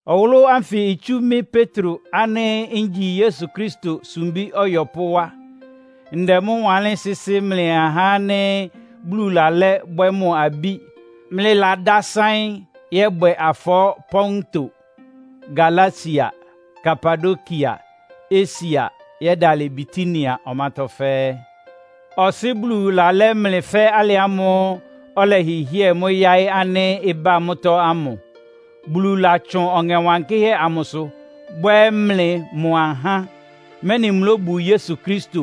Ɔwʋlʋ́ ánfɩ itsú mɩ́ Petro ánɩ́ ngyi Yesu Kristo sumbí ɔyɔpʋ́ wá. Ndɛ mʋ́ wanlɩ́n sɩ́sɩ́ mlɩ ahá ánɩ́ Bulu lalɛ́ bwɛ́ mʋ abí, mlɩladásáɩ́n yɔ́bwɛ afɔɔ́ Ponto, Galatia, Kapadokia, Asia yɛ́dalɩ Bitinia ɔmátɔ́ fɛ́ɛ́. Ɔsɩ́ Bulu lalɛ́ mlɩ fɛ́ alɩ ámʋ́ʋ́ ɔlɛhɩhɩ́ɛ mʋ́ yáɩ́ ánɩ́ ɩbá mʋ́tɔ́ ámʋ. Bulu latsʋn Ɔŋɛ Wankɩ́hɛ́ amʋsʋ bwɛ́ mlɩ mʋ ahá, mɛ́nɩ mlóbu Yesu Kristo,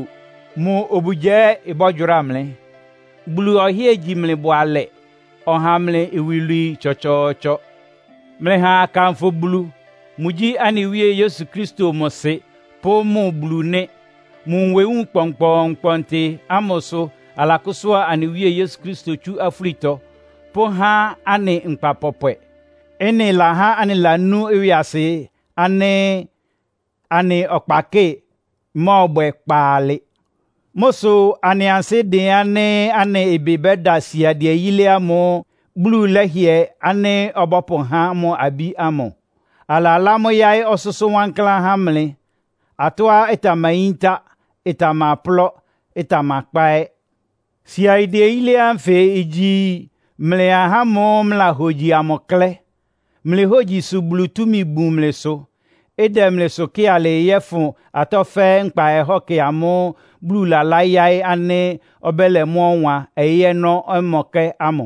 mʋ obugya ɛ́ ɩbɔ́gyʋráa mlɩ. Bulu ɔhɩ́ɛ gyi mlɩ bʋalɛ, ɔha mlɩ iwilwii tsɔtsɔɔtsɔ! Mlɩha akanfʋ Bulu. Mʋgyí anɩ Wíe Yesu Kristo mʋ Sɩ pʋ́ mʋ Bulu nɩ́. Mʋ nwewúun kpɔnkpɔɔnkpɔntɩ ámʋ sʋ alakʋ́sʋ́a anɩ Wíe Yesu Kristo tsú afúlitɔ pʋ́há anɩ nkpa pɔpwɛ. Ɩ́nɩ lahá anɩlanú ɩwɩasɩ ánɩ́ anɩ ɔkpakɩ́ɩ mɔ́ɔbwɛ kpaalɩ. Mʋ́ sʋ anɩ ansɩ́dɩn ánɩ́ anɩ ɩbɩ bɛ́da siadɩɛ yílé ámʋ́ʋ́ Bulu lɛ́hɩɛ ánɩ́ ɔbɔ́pʋhá mʋ abí ámʋ. Alalá mʋ́ yáɩ́ ɔsʋ́sʋ́ wankláán há mlɩ, atɔ́á ɩtamayíntá, ɩtamaplɔ́, ɩtamakpá ɛ́. Siadɩɛ yílé ánfɩ igyi mlɩ ahá ámʋ́ʋ́ mlɩlahogyi amʋ klɛ́. Mlɩ hógyi sʋ Bulu túmi bun mlɩsʋ, ɩdɛ mlɩsʋ kɩ́ɩ alɩɩ yɔ́fʋn atɔ́ fɛ́ɛ́ nkpa ɔhɔ́kɛ ámʋ́ʋ́ Bulu lalá yáɩ́ ánɩ́ ɔbɛ́lɛ mʋ́ ɔwan ɔyɩ́ ɔnɔ́mɔkɛ́ ámʋ.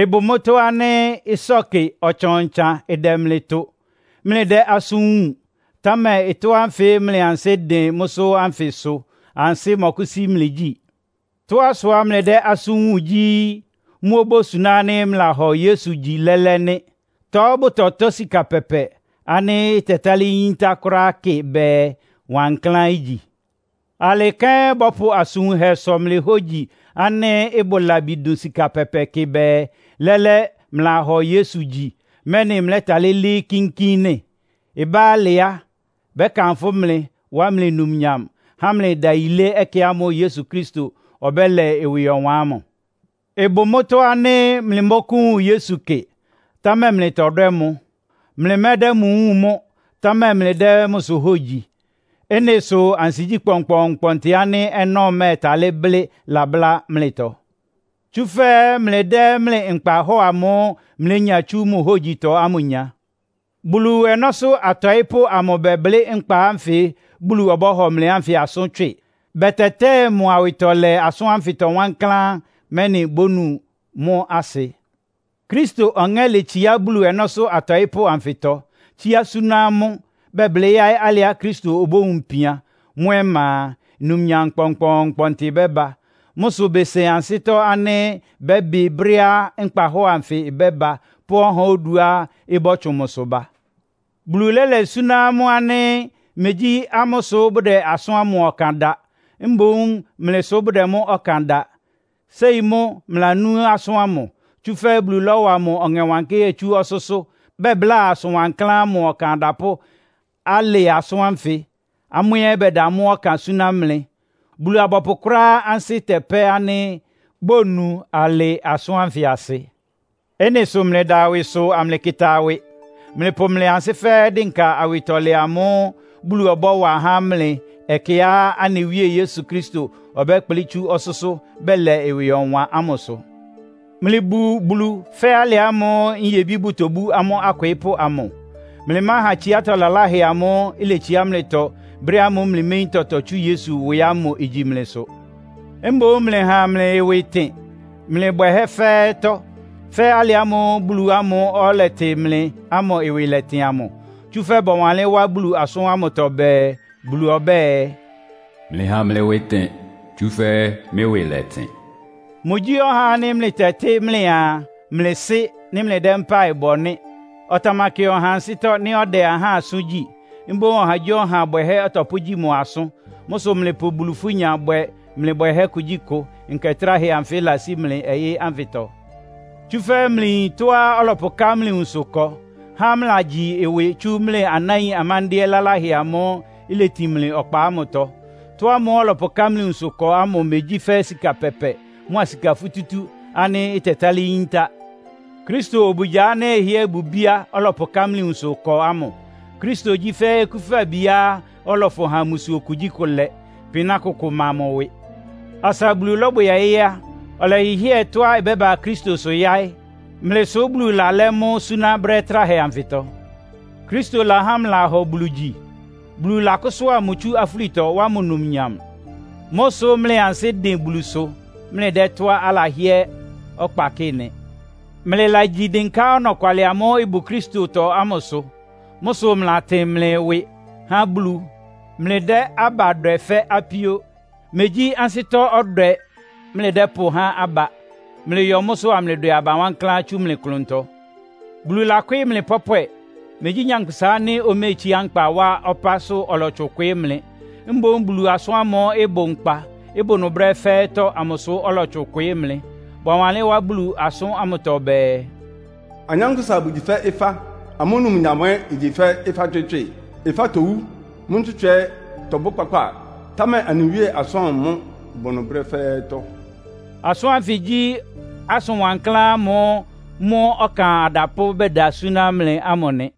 Ɩbʋ mʋ́tɔ́ ánɩ́ ɩsɔ́kɩ ɔtsan-ɔtsan ɩdɛ mlɩ tʋ, mlɩdɛ́ asʋ́n wúun, támɛ ɩtɔ́ ánfɩ mlɩ ansɩ́dɩn mʋ́sʋ́ ánfɩ sʋ ansɩ́ mɔkʋ́sí mlɩ gyí. Tɔ́á sʋá mlɩdɛ́ asʋ́n wúun gyí, mʋ́ obósuná ánɩ́ mlɩlahɔ Yesu gyi lɛ́lɛ́ nɩ́. Tɔ́ bʋtɔtɔ́ sika pɛpɛ ánɩ́ ɩtɛtálɩ́ yíntá kʋ́ráá kɩ bɛɛ, wankláán igyi. Alɩ kɛ́n bɔ́pʋ asʋn wunhɛ sɔ mlɩ hógyi ánɩ́ ɩbʋ labi dʋn sika pɛpɛ kɩ bɛɛ, lɛ́lɛ́ mlɩlahɔ Yesu gyi, mɛ́nɩ mlɛ́talɩ́ lɩ́ɩ́ kínkín nɩ́. Ɩbá alɩ á, bɛ́kanfʋ́ mlɩ, wá mlɩ numnyam, há mlɩ ɩdayilé ɛkɛ ámʋ́ʋ́ Yesu Kristo ɔbɛ́lɛ ɩwɩ ɔwan ámʋ. Ɩbʋ mʋ́tɔ́ ánɩ́ mlɩmɔ́kʋ́wun Yesu kɩ, támɛ mlɩtɔdwɛ́ mʋ. Mlɩmɛ́dɛ́ mʋ wúun mʋ́, támɛ mlɩdɛ́ mʋsʋ hógyi. Ɩ́nɩ sʋ ansigyí kpɔnkpɔɔnkpɔntɩ ánɩ́ ɔnɔ́ mɛ́ɛtalɩ́ blɩ́ labʋ́lá mlɩtɔ. Tsúfɛ́ mlɩdɛ́ mlɩ nkpahɔ́ɔ amʋ́ʋ́ mlénya tsú mʋ hógyitɔ ámʋ nya. Bulu ɔnɔ́sʋ́ atɔɩ́pʋ́ amʋ bɛblɩ́ nkpa ánfɩ Bulu ɔbɔ́hɔ mlɩ ánfɩ asʋ́n tswɩ. Bɛtɛtɛ́ɛ mʋ awɩtɔlɛ asʋ́n ánfɩtɔ wankláán, mɛ́nɩ bónu mʋ́ asɩ. Kristo Ɔŋɛ́ letsiá Bulu ɔnɔ́sʋ́ atɔɩ́pʋ́ anfɩtɔ, tsíá súná amʋ́, bɛblɩ́ yáɩ́ alɩá Kristo obówun ipian. Mʋ́ ɔma a, numnyam kpɔnkpɔɔnkpɔntɩ bɛ́ba. Mʋ́ sʋ besen ansɩ́tɔ́ ánɩ́ bɛ́bɩ brɛ́á nkpahɔ́ɔ anfɩ ɩbɛ́ba pʋ́ ɔhá oduá ɩbɔ́tsʋn mʋsʋ ba. Bulu lɛ́lɛ súná amʋ́ ánɩ́ megyí amʋ́ sʋ́ bʋdɛ asʋ́n ámʋ ɔkan da, mboún mlɩ sʋ bʋdɛ mʋ́ ɔkan da. Séi mʋ́ mlɩlanú asʋ́n ámʋ. Tsúfɛ́ Bulu lɔ́wa mʋ Ɔŋɛ Wankɩ́hɛ́ tsú ɔsʋ́sʋ́ bɛbláa asʋn wankláán ámʋ ɔkan adapʋ́ alɩ asʋ́n ánfɩ, amʋ́ ɛ́ bɛda mʋ́ ɔkan súná mlɩ. Bulu-abɔpʋ kʋ́ráá ansɩ́ tɛpɛ́ ánɩ́ bónu alɩ asʋ́n ánfɩ asɩ. Ɩ́nɩ sʋ mlɩda ɩwɩsʋ amlɩkɩta ɩwɩ. Mlɩpʋ mlɩ ansɩ́ fɛ́ɛ́ dɩnka awɩtɔlɛ amʋ́ʋ́ Bulu ɔbɔ́wa há mlɩ ɛkɛá anɩ Wíe Yesu Kristo ɔbɛ́kplɩ́ tsú ɔsʋ́sʋ́ bɛlɛ ɩwɩ ɔwan ámʋsʋ. Mlɩbu Bulu fɛ́ alɩ ámʋ́ʋ́ nyebí bʋtobú amʋ́ akwɩɩ́pʋ́ amʋ. Mlɩmáha tsiátɔ́ laláhɛ amʋ́ʋ́ iletsiá mlɩtɔ brɛ́ ámʋ́ʋ́ mlɩméyín tɔtɔ tsú Yesu ɩwɩ ámʋ igyi mlɩsʋ. Mboún mlɩha mlɩ ɩwɩ ɩtɩn mlɩ bwɛhɛ́ fɛ́ɛ́tɔ́, fɛ́ alɩ ámʋ́ʋ́ Bulu ámʋ́ʋ́ ɔlɛtɩ mlɩ ámʋ ɩwɩ lɛ́tɩn amʋ. Tsúfɛ́ bɔwanlɩ́n wá Bulu asʋ́n ámʋtɔ bɛɛ, “Bulu ɔbɛ́ɛ, ‘Mlɩha mlɩ ɩwɩ ɩtɩn, tsúfɛ́ mɩ́ ɩwɩ lɛtɩn.’” Mʋgyí ɔhá ánɩ́ mlɩtɛtɩ́ mlɩaa, mlɩ Sɩ́ nɩ́ mlɩdɛ́ mpáɩ bɔ nɩ́. Ɔtamakɩ ɔha ansɩ́tɔ́ nɩ́ ɔdɛ ahá asʋ́n gyí. Mboún ɔhagyíɔha bwɛhɛ́ ɔtɔpʋ́gyí mʋ asʋ́n. Mʋ́ sʋ mlɩpʋ Bulu-ifúnya bwɛ mlɩ bwɛhɛ́ kugyíkʋ nkɛ tráhɛ anfɩ ɩlasí mlɩ ɔyɩ́ ánfɩtɔ. Tsúfɛ́ mlɩyin tɔ́á ɔlɔpʋká mlɩ nwunsʋ ɩkɔ, há mlɩlagyi ɩwɩ tsú mlɩ anáin amándɩ́ɛ́ laláhɛ ámʋ́ʋ́ iletin mlɩ ɔkpa ámʋtɔ. Ɩtɔ́ ámʋ́ʋ́ ɔlɔpʋká mlɩ nwunsʋ ɩkɔ ámʋ megyí fɛ́ sika pɛpɛ mʋ́a sika futútú ánɩ́ ɩtɛtálɩ́ yíntá. Kristo obugya ánɩ́ ɩhɩ́ɛ́ bʋ ibíá ɔlɔpʋká mlɩ nwunsʋ ɩkɔ ámʋ. Kristo gyí fɛ́ okúfabiá ɔlɔfʋn ha mbusuo kugyíkʋ lɛ, pɩná kʋkʋ ma mʋ ɩwɩ. Asa Bulu lɔ́bwɛ ɔyɩ́ á, ɔlɛhɩhɩ́ɛ tɔ́á ɩbɛ́ba Kristosʋ yáɩ́. Mlɩ sʋ́ Bulu lalɛ́ mʋ súná brɛ́ tráhɛ anfɩtɔ. Kristo lahá mlɩlahɔ Bulu gyi. Bulu lɔ́kʋsʋ́a mʋ tsú afúlitɔ, wá mʋ numnyam. Mʋ́ sʋ́ mlɩ ansɩ́dɩn Bulusʋ, mlɩdɛ́ tɔ́á alahɩ́ɛ́ ɔkpa kɩ́ɩ nɩ. Mlɩlagyi dɩnká ɔnɔkwalɩ amʋ́ʋ́ ɩbʋ Kristotɔ ámʋsʋ. Mʋ́ sʋ mlɩlatɩn mlɩ ɩwɩ há Bulu, mlɩdɛ́ aba dwɛ fɛ́ apíó. Megyí ansɩ́tɔ́-ɔdwɛ mlɩdɛ́pʋhá aba. Mlɩyɔ mʋ́sʋ́ amlɩdwɛ aba wankláán tsu mlɩ klʋntɔ. Bulu lakwɩ́ɩ́ mlɩ pɔ́pwɛ. Megyí nyankpʋsa ánɩ́ oméetsiá nkpa wá ɔpásʋ́ ɔlɔtsʋn kwɩɩ́ mlɩ. Mboún Bulu asʋ́n ámʋ́ʋ́ ɩbʋ nkpa, ɩbʋ ɩnʋ brɛ́ fɛ́ɛ́tɔ́ amʋsʋ ɔlɔtsʋn kwɩɩ́ mlɩ. Bɔwanlɩ́n wá Bulu asʋ́n ámʋtɔ bɛɛ, “Anyánkpʋ́sa bʋgyi fɛ́ ɩfá. Amʋ́ numnyam ɛ́ igyi fɛ́ ɩfá ntswɩ́tswɩ. Ɩfá towú, mʋ́ ntswɩ́tswɩ tɔbʋ́ kpákpáa, támɛ anɩ Wíe asʋ́n ámʋ mʋ́ bʋ ɩnʋ brɛ́ fɛ́ɛ́tɔ́.” Asʋ́n ánfɩ gyí asʋn wankláán ámʋ́ʋ́ mʋ́ ɔkan adapʋ́ bɛda súná mlɩ ámʋ nɩ.